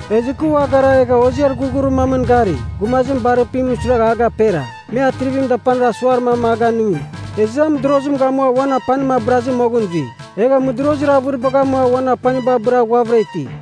Ezɨ kɨ ua gara egha hoziar ghurghurir mamɨn gari, gumazim barirpimɨn suiragha a gapera. Me atrivimɨn dapanir asuar mam a ganɨngi, ezɨ a mɨdorozim gamua uan apanim abɨrazɨ moghɨn zui, egha mɨdorozir avɨribagh amua uan apaniba abɨra ghuavɨra iti.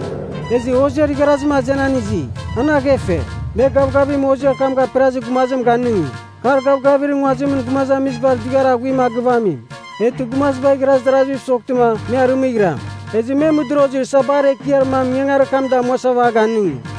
Ezɨ hoziar igharazim azenan izi, an aghefe. Me gavgavim hoziar kam gaperazir gumazim ganɨngi, kar gavgavir nguazimɨn gumazamizibar dughiar aghuim a gɨvamim, eghtɨ gumaziba igharaz daraziv soghtɨma me arɨmɨghiram. Ezɨ me mɨdorozir sabar ekiar mam ingangarir kam damuasava a ganɨngi.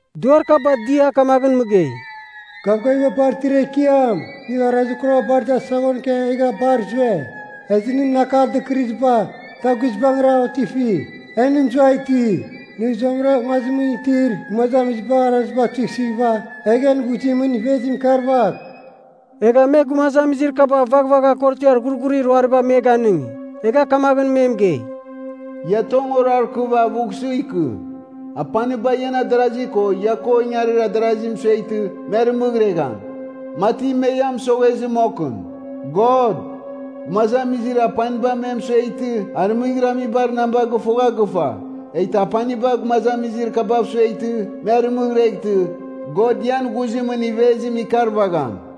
Duar kaba dia kamaghɨn mɨgei, “Gavgaviba bar itir Ekiam, nɨ arazir kuraba bar dar saghon ikia egha bar zue! Ezɨ nɨn akar dɨkɨrɨziba da guizbangɨra otifi! E nɨ mɨzua iti, nɨ zuamɨra nguazimɨn itir gumazamizibar araziba tuisɨghɨva, egh en ghuzimɨn ivezim ikarvagh!” Egha me gumazamizir kaba vaghvagha korotiar ghurghurir ruariba me ganɨngi, egha kamagh me mɨgei, “Ia tong orarkɨva avughsɨ ikɨ. Apaniba ian adarazi ko ia ko ingari darazi mɨsueghtɨ me arɨmɨghiregham, mati me ia mɨsoghezɨ mokɨn. God, gumazamizir apaniba me mɨsueghtɨ arɨmɨghiramibar namba gɨfogha gɨfa, eghtɨ apaniba gumazamizir kabav sueghtɨ me arɨmɨghireghtɨ, God ian ghuzimɨn ivezim ikarvagham.”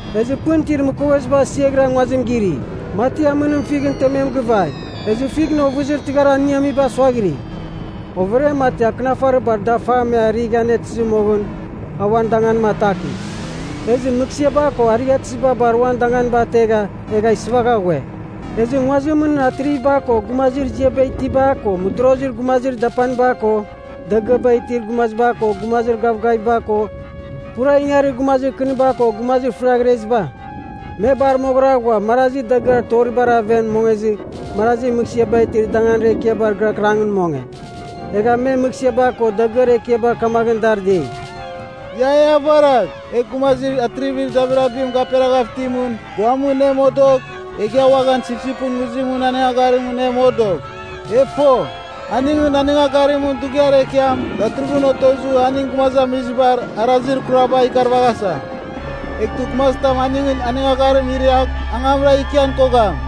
Ezɨ pɨn itir mɨkoveziba asiaghira nguazim giri, mati amɨnim fighɨn temem givai, ezɨ fighɨn ovɨzir tɨghar aniamiba suaghiri. Overiam mati, akɨnafarir bar dafam me a righa anetɨzɨ moghɨn, a uan danganim ataki. Ezɨ mɨghsɨaba ko arighatɨziba bar uan danganiba ategha, egha sɨvagha ghue. Ezɨ nguazimɨn atriviba ko gumazir ziaba itiba ko mɨdorozir gumazir dapaniba ko dagɨaba itir gumaziba ko gumazir gavgaviba ko pura ingangarir gumazir kɨniba ko gumazir fɨriaghreziba, me bar moghɨra ghua marazi dagɨar toribar aven mongezɨ marazi mɨghsɨabar itir dagɨar ekiabar gɨrakɨrangɨn monge. Egha me mɨghsɨaba ko dagɨar ekiaba kamaghɨn dar dei, “Ia e avaragh, egh gumazir atrivir dabirabim gaperaghav itimɨn guamɨn e modogh, egh ia uaghan Sipsipɨn Nguzimɨn anɨngagharimɨn e modogh! E fo, aningɨn anɨngagharimɨn dughiar ekiam datɨrɨghɨn otozɨ aning gumazamizibar arazir kuraba ikarvaghasa. Eghtɨ gumazitam aningɨn anɨngagharim iriagh, angamra ikian kogham!”